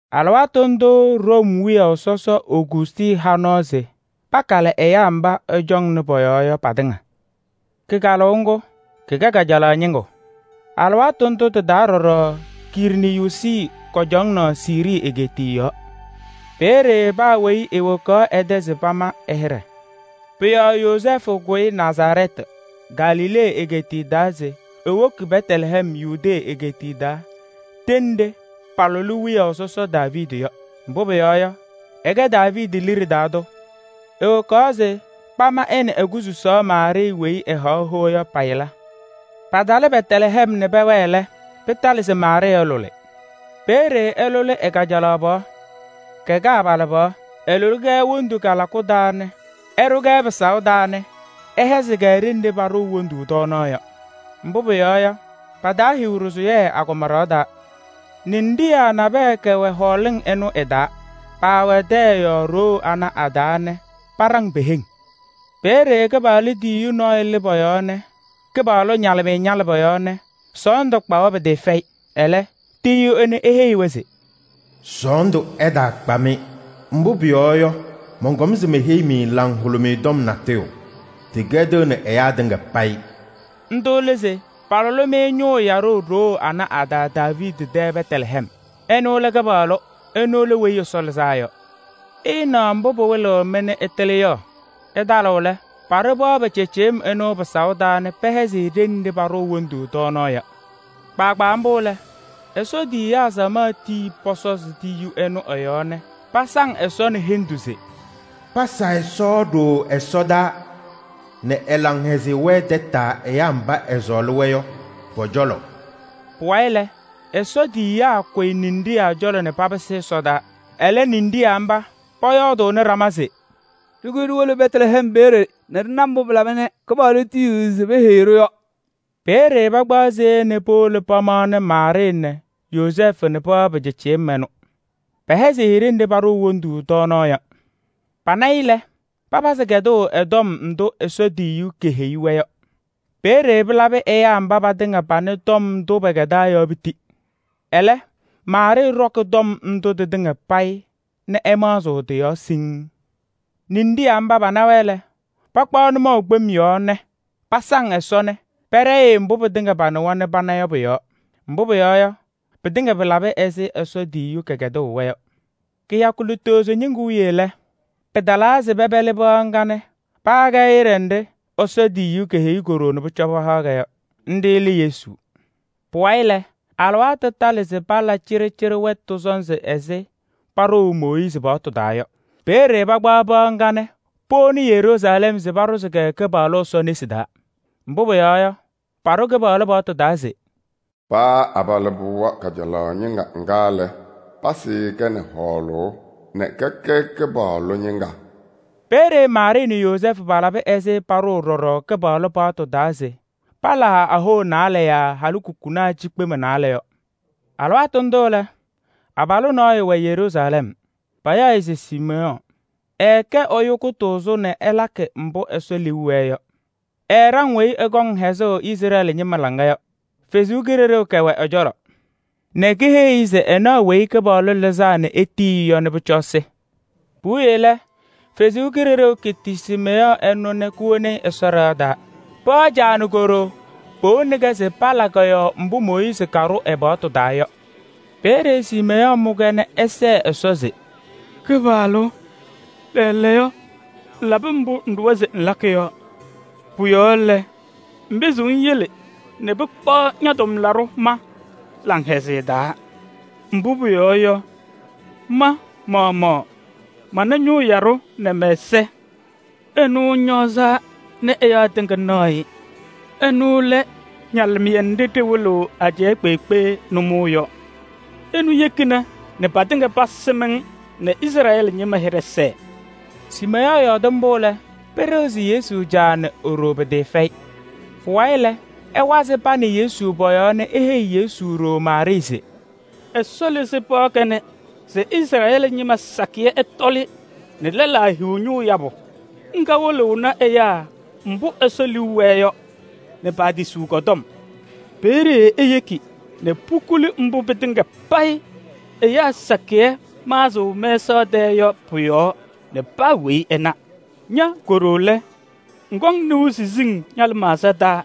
Alɩwaatʋ ndʋʋ Room wiyaʋ sɔsɔ Ogustɩ ha nɔɔ se pakalɩ ɛyaa mba ɛcɔŋnɩ pɔ-yɔɔ yɔ patɩŋa. Kɩkalʋʋ ŋgʋ kɩkɛnɩ kajalaɣ ñɩŋgʋ. Alɩwaatʋ ndʋ tɩ-taa ɖɔɖɔ Kiriiniyuusi cɔŋaɣnɩ Siirii egeetiye yɔɔ. Peeye paa weyi ewokaɣ ɛ-tɛ se pama ɛ-hɩɖɛ. Pʋ-yɔɔ Yozɛɛfʋ kʋyɩ Nazarɛɛtɩ, Galilee egeetiye taa se ewoki Bɛtlɛhɛm, Yudee egeetiye taa ɖenɖe paalʋlɩ wiyaʋ sɔsɔ Daaviidi yɔ. Mbʋ pʋyɔɔ yɔ, ɛkɛ Daaviidi liɖe taa tʋ. Ewokaɣ se pama ɛ nɛ e-kususaɣ Maarɩɩ weyi ɛhaɣ hoa yɔ pa-yɩla. Patalɩ Bɛtlɛhɛm nɛ pɛwɛɛ lɛ, pɩtalɩ se Maarɩɩ ɛlʋlɩ. Peeye ɛlʋlɩ ɛ-kajalaɣ pɩɣa, kɛkɛ abalɩbɩɣa. Ɛlʋlɩ-kɛ wondu kalakʋ taa nɛ ɛɖʋ-kɛ pɩsaʋ taa nɛ ɛhɛzɩ-kɛ ɖenɖe paɖʋʋ wondu tɔɔnaɣ yɔ. Mbʋ pʋyɔɔ yɔ, pataahiɣ ɖɩsʋyɛ agɔma ɖɩɣa taa. Ninɖiɣyaa nabɛyɛ kɛwɛ hɔɔlɩŋ ɩnʋ ɩ-taa. Paawɛ tɛyɛ ɖoo ana a-taa nɛ paɖaŋ pe-heŋ. Peeye Kɩpaɣlʋ tiyiyu nɔɔyʋ lɩ pɔ-cɔlɔ nɛ Kɩpaɣlʋ ñalɩmɩyɛ ñalɩ pɔ-yɔɔ nɛ sɔɔndʋ kpa-wɛ pɩtɩɩfɛyɩ. Ɛlɛ, tiyiyu ɛnʋ eheyi-wɛ se: “Sɔɔndʋ ɛtaakpa-mɩ, mbʋ pʋyɔɔ yɔ, mɔnkɔm se meheyi-mɩ laŋhʋlʋmɩyɛ tɔm natʋyʋ. Tɩkɛdɩɣnɩ ɛyaa tɩŋa payɩ.” Ndʋ lɛ se palʋlɩ-mɩ Ñʋʋ Yaɖʋ ɖoo anɛ a-taa Daaviidi tɛ Bɛtlɛhɛm. Ɛnʋ lɛ Kɩpaɣlʋ, ɛnʋ lɛ Weyi Ɛsɔ Lɩzaa Yɔ. Ɩɩnaɣ mbʋ pɩwɩlɩɣ-mɩ nɛ ɩtɩlɩ yɔ: ɩtalɩɣ lɛ, paɖʋ pɩɣa pɩcɩɩcɩyɩm ɛnʋ pɩsaʋ taa nɛ pɛhɛzɩ-kɛ ɖenɖe paɖʋʋ wondu tɔɔnaɣ yɔ. Kpaagbaa mbʋ lɛ, Ɛsɔ tiyiyaa samaɣ tii pɔsɔzɩ tiyiyu ɛnʋ ɛ-yɔɔ nɛ pasaŋ Ɛsɔ nɛ hendu se: “Pasa Ɛsɔ ɖooo ɛsɔdaa nɛ ɛ-laŋhɛzɩyɛ wɛɛ tataa ɛyaa mba ɛsɔɔlɩ-wɛ yɔ pɔ-cɔlɔ.” Pʋwayɩ lɛ, Ɛsɔ tiyiyaa kʋyɩ ninɖiɣyaa cɔlɔ nɛ papɩsɩ ɛsɔdaa. Ɛlɛ ninɖiɣyaa mba pɔyɔɔdɩnɩ ɖama se: “Ɖɩkʋyɩ ɖiwolo Bɛtlɛhɛm peeye nɛ ɖɩna mbʋ pɩlaba nɛ Kɩpaɣlʋ tiyiɣ se peheyi-ɖʋ yɔ.” Peeye pakpaɣ seya nɛ powolo pamaɣnɩ Maarɩɩ nɛ Yozɛɛfʋ nɛ pɩɣa pɩcɩɩcɩyɩm ɛnʋ. Pɛhɛzɩ-ɩ ɖenɖe paɖʋʋ wondu tɔɔnaɣ yɔ. Pana-ɩ lɛ, papazɩ kɛdʋʋ ɛ-tɔm ndʋ Ɛsɔ tiyiyu keheyi-wɛ yɔ. Peeye pɩlabɩ ɛyaa mba patɩŋa panɩ tɔm ndʋ pɛkɛdaa yɔ piti. Ɛlɛ, Maarɩɩ ɖɔkɩ tɔm ndʋ tɩtɩŋa payɩ nɛ ɛmaɣzɩɣ tɩ-yɔɔ siŋŋ. Ninɖiɣyaa mba pana-wɛ lɛ, pakpaɣ nʋmɔʋ kpem yɔɔ nɛ pasaŋ Ɛsɔ nɛ pɛɖɛyɩɣ-ɩ mbʋ pɩtɩŋa panɩwa nɛ pana yɔ pʋ-yɔɔ. Mbʋ pʋyɔɔ yɔ, pɩtɩŋa pɩlabɩ ɛzɩ Ɛsɔ tiyiyu kɛkɛdʋʋ-wɛ yɔ. Kɩyakʋ lutozo ñɩŋgʋ wiye lɛ, pɩtalaa se pɛpɛlɩ pɩɣa ŋga nɛ paha-kɛ hɩɖɛ nɖɩ Ɛsɔ tiyiyu keheyi ko-ɖoo nɛ pʋcɔ ɛhaɣ-kɛ yɔ: nɖɩ lɛ Yesu. Pʋwayɩ lɛ, alɩwaatʋ talɩ se pala cɩɖɩcɩɖɩ wɛtʋ sɔnzɩ ɛzɩ paɖʋʋ Mooyiizi paɣtʋ taa yɔ. Peeye pakpaɣ pɩɣa ŋga nɛ powoni Yeruusalɛm se paɖʋzɩ-kɛ Kɩpaɣlʋ Ɛsɔ nesi taa. Mbʋ pʋyɔɔ yɔ, paɖʋ Kɩpaɣlʋ paɣtʋ taa se: “Paa abalɩbɩɣa kajalaɣ ñɩŋga ŋga lɛ, pasɩɩ-kɛ nɛ hɔɔlʋʋ nɛ kɛkɛ Kɩpaɣlʋ ñɩŋga.” Peeye Maarɩɩ nɛ Yozɛɛfʋ palaba ɛzɩ paɖʋʋ ɖɔɖɔ Kɩpaɣlʋ paɣtʋ taa se palaa ahoa naalɛ yaa halikukunaa cikpema naalɛ yɔ. Alɩwaatʋ ndʋ lɛ, abalʋ nɔɔyʋ wɛ Yeruusalɛm, payaɣ-ɩ se Siimeyɔɔ. Ɛɛkɛ ɛyʋ kʋtʋʋzʋ nɛ ɛlakɩ mbʋ Ɛsɔ liu wɛɛ yɔ. Ɛɛɖaŋ weyi ɛkɔŋ hɛzʋʋ Izrɛɛlɩ ñɩma laŋa yɔ. Ɛsɔ Kalɩzaɣ kɛwɛ ɛ-cɔlɔ nɛ keheyi-i se ɛnaɣ Weyi Kɩpaɣlʋ Lɩzaa nɛ etiyi-i yɔ nɛ pʋcɔ ɛsɩ. Puwiye lɛ, Ɛsɔ Kalɩzaɣ keti Siimeyɔɔ ɛnʋ nɛ kowoni-i Ɛsɔ ɖɩɣa taa. Pɩɣa caa nɛ ko-ɖoo powoni-kɛ se pala kɔ-yɔɔ mbʋ Mooyiizi kaɖʋ ɛ-paɣtʋ taa yɔ. Peeye Siimeyɔɔ mʋ-kɛ nɛ ɛsɛɛ Ɛsɔ se: “Kɩpaɣlʋ! Lɛɛlɛɛyɔ ŋlabɩ mbʋ ŋɖʋwa se ŋlakɩ yɔ. Pʋ-yɔɔ lɛ, ŋpɩzɩɣ ŋyele nɛ pɩkpaɣ ña-tʋmlaɖʋ ma laŋhɛzɩyɛ taa. Mbʋ pʋyɔɔ yɔ, ma-maɣmaɣ mana Ñʋʋ Yaɖʋ nɛ mɛ-ɛza, ɛnʋ ŋñɔɔzaa nɛ ɛyaa tɩŋa naɣ-ɩ. Ɛnʋ lɛ ñalɩmɩyɛ nɖɩ ɖɩwɩlɩɣ ajɛɛ kpeekpe nʋmɔʋ yɔ. Ɛnʋ yekina nɛ patɩŋa pasɩm-ŋ nɛ Izrɛɛlɩ ñɩma hɩɖɛ sɛɛ.” Siimeyɔɔ yɔɔdɩ mbʋ lɛ, pɩɖɩɣzɩ Yesu caa nɛ e-ɖoo pɩtɩɩfɛyɩ. Pʋwayɩ lɛ, ɛwazɩ pa nɛ Yesu pɔ-yɔɔ nɛ eheyi Yesu ɖoo Maarɩɩ se: “Ɛsɔ lɩzɩ pɩɣa kanɛ se Izrɛɛlɩ ñɩma sakɩyɛ ɛtɔlɩ nɛ lɛlaa hiɣ ñʋʋ yabʋ. Ŋga wɩlɩɣnɩ ɛyaa mbʋ Ɛsɔ liu wɛɛ yɔ nɛ paatisiɣ kɔ-tɔm. Peeye eyeki nɛ pukuli mbʋ pɩtɩŋa payɩ ɛyaa sakɩyɛ maɣzɩɣ mɛsaɣ tɛɛ yɔ pʋ-yɔɔ nɛ paa weyi ɛna. Ña ko-ɖoo lɛ, ŋkɔŋ nɩʋ siziŋ ña-lɩmaɣza taa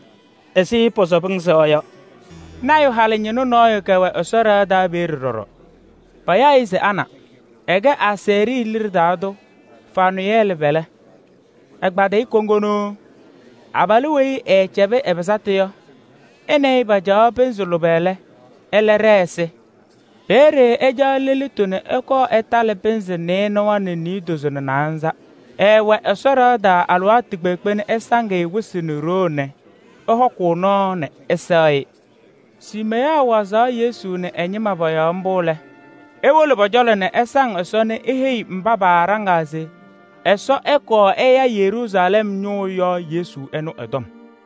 ɛzɩ pɔsɔbɩ-ŋ sɩɣa yɔ.” Lɔɔyaɣ tʋ halɩñɩnʋ nɔɔyʋ kɛwɛ Ɛsɔ ɖɩɣa taa peeye ɖɔɖɔ. Payaɣ-ɩ se Ana. Ɛkɛ Asɛɛrɩ liɖe taa tʋ Fanʋyɛɛlɩ pɛlɛ, ɛkpadɩyɩ kuŋgu. Abalʋ weyi ɛɛcɛbɩ ɛ-pɩsatʋ yɔ, ɛ nɛ ɩ pacaɣ pɩnzɩ lʋbɛ lɛ, ɛlɛ ɖɛɛ ɛsɩ. Peeye ɛcaɣ lelitu nɛ ɛkɔɔ ɛtalɩ pɩnzɩ nɩɩnʋwa nɛ niidozo nɛ naanza. Ɛɛwɛ Ɛsɔ ɖɩɣa taa alɩwaatʋ kpeekpe nɛ ɛsaŋ-ɩ wɩsɩ nɛ ɖoo nɛ ɛhɔkʋʋ nɔɔ nɛ ɛsɛɣ-ɩ. Siimeyɔɔ wazaɣ Yesu nɛ ɛ-ñɩma pɔ-yɔɔ mbʋ lɛ, ewolo pɔ-cɔlɔ nɛ ɛsaŋ Ɛsɔ nɛ eheyiɣ mba paaɖaŋaa se Ɛsɔ ɛkɔɔ ɛya Yeruusalɛm ñʋʋ yɔ Yesu ɛnʋ ɛ-tɔm.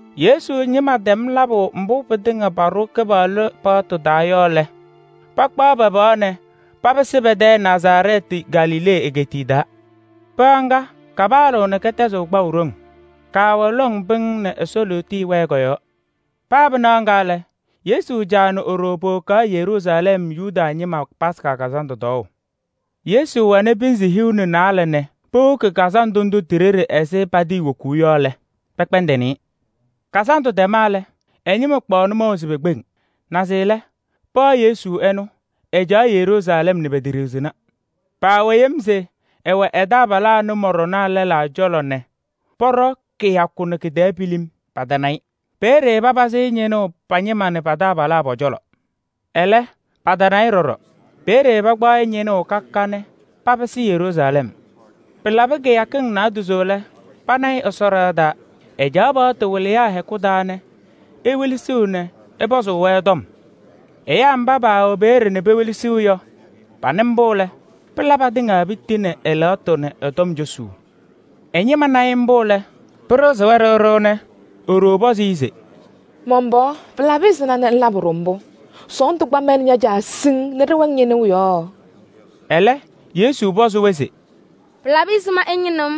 Yesu ñɩma tɛm labʋ mbʋ pɩtɩŋa paɖʋ Kɩpaɣlʋ paɣtʋ taa yɔ lɛ, pakpaɣ pa-pɩɣa nɛ papɩsɩ pɛ-tɛ Nazarɛɛtɩ, Galilee egeetiye taa. Pɩɣa ŋga, kapaɣlaɣ nɛ kɛtɛzɩɣ kpaʋ ɖoŋ. Kaawɛnɩ lɔŋ pɩŋŋ nɛ Ɛsɔ lootiye wɛɛ kɔ-yɔɔ. Paa pɩnaɣ ŋga lɛ, Yesu caa nɛ e-ɖoo powokaɣ Yeruusalɛm Yomiye Taa Lɩʋ Kazandʋ tɔɔʋ. Yesu wɛnɩ pɩnzɩ hiu nɛ naalɛ nɛ powoki kazandʋ ndʋ ti-ɖeɖe ɛzɩ patɩɩwokuu yɔ lɛ, pɛkpɛndɩnɩ-ɩ. Kazandʋ tɛma lɛ, ɛ-ñɩma kpaɣ nʋmɔʋ se pekpeŋ. Naze lɛ, pɩɣa Yesu ɛnʋ, ɛcaɣ Yeruusalɛm nɛ peteɖiɣzina. Paawɛ yem se ɛwɛ pa-taabalaa nʋmɔɖɔnaa lɛlaa cɔlɔ nɛ pɔɖɔ kɩyakʋ nɛ kɩ-tɛɛ pilim, patana-ɩ. Peeye papazɩ-ɩ ñɩnʋʋ pa-ñɩma nɛ pa-taabalaa pɔ-cɔlɔ. Ɛlɛ, patana-ɩ ɖɔɖɔ. Peeye pakpaɣ-ɩ ñɩnʋʋ ka ka ka nɛ papɩsɩ Yeruusalɛm. Pɩlabɩ kɩyakɩŋ naadozo lɛ, pana-ɩ Ɛsɔ ɖɩɣa taa. Ɛcaɣ paɣtʋ wɩlɩyaa hɛkʋ taa nɛ ewelesiɣ nɛ ɛpɔzʋʋ-wɛ tɔm. Ɛyaa mba paawɛ peeye nɛ pewelesiɣ yɔ, panɩ mbʋ lɛ, pɩla patɩŋa piti nɛ ɛ-lɛɣtʋ nɛ ɛ-tɔm cosuu. Ɛ-ñɩma na-ɩ mbʋ lɛ, pɩɖɩɣzɩ-wɛ ɖɩɣ ɖɩɣ nɛ e-ɖoo pɔzɩ-ɩ se: “Man-pɩɣa! Pɩlabɩ ɛzɩma nɛ ŋlabɩ-ɖʋ mbʋ? Sɔɔndʋ kpa ma nɛ ña-caa siŋŋ nɛ ɖɩwɛ-ŋ ñɩnʋʋ yɔɔ.” Ɛlɛ, Yesu pɔzɩ-wɛ se: “Pɩlabɩ ɛzɩma nɛ ɩñɩnɩɣ-m?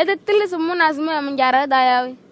Ɩtatɩlɩ se pʋmʋnaa se mɛwɛɛ man-Caa ɖɩɣa taa yaa we?”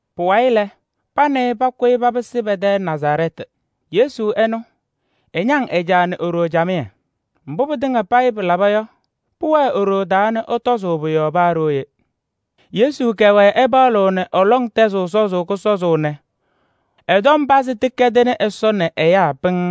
Pʋwayɩ lɛ, pa nɛ ɩ pakʋyɩ papɩsɩ pɛ-tɛ Nazarɛɛtɩ nɛ ɛñaŋ-wɛ alɩwaatʋ kpeekpe. Mbʋ pɩtɩŋa payɩ pɩlaba yɔ, pʋwɛɛ e-ɖoo taa nɛ ɛtɔzʋʋ pʋ-yɔɔ paa ɖooye. Yesu kɛwɛɛ ɛpaɣlɩɣ nɛ ɛ-lɔŋ tɛzɩɣ sɔzʋʋ kʋsɔzʋʋ nɛ ɛ-tɔm pazɩ tɩkɛdɩnɩ Ɛsɔ nɛ ɛyaa pɩŋŋ.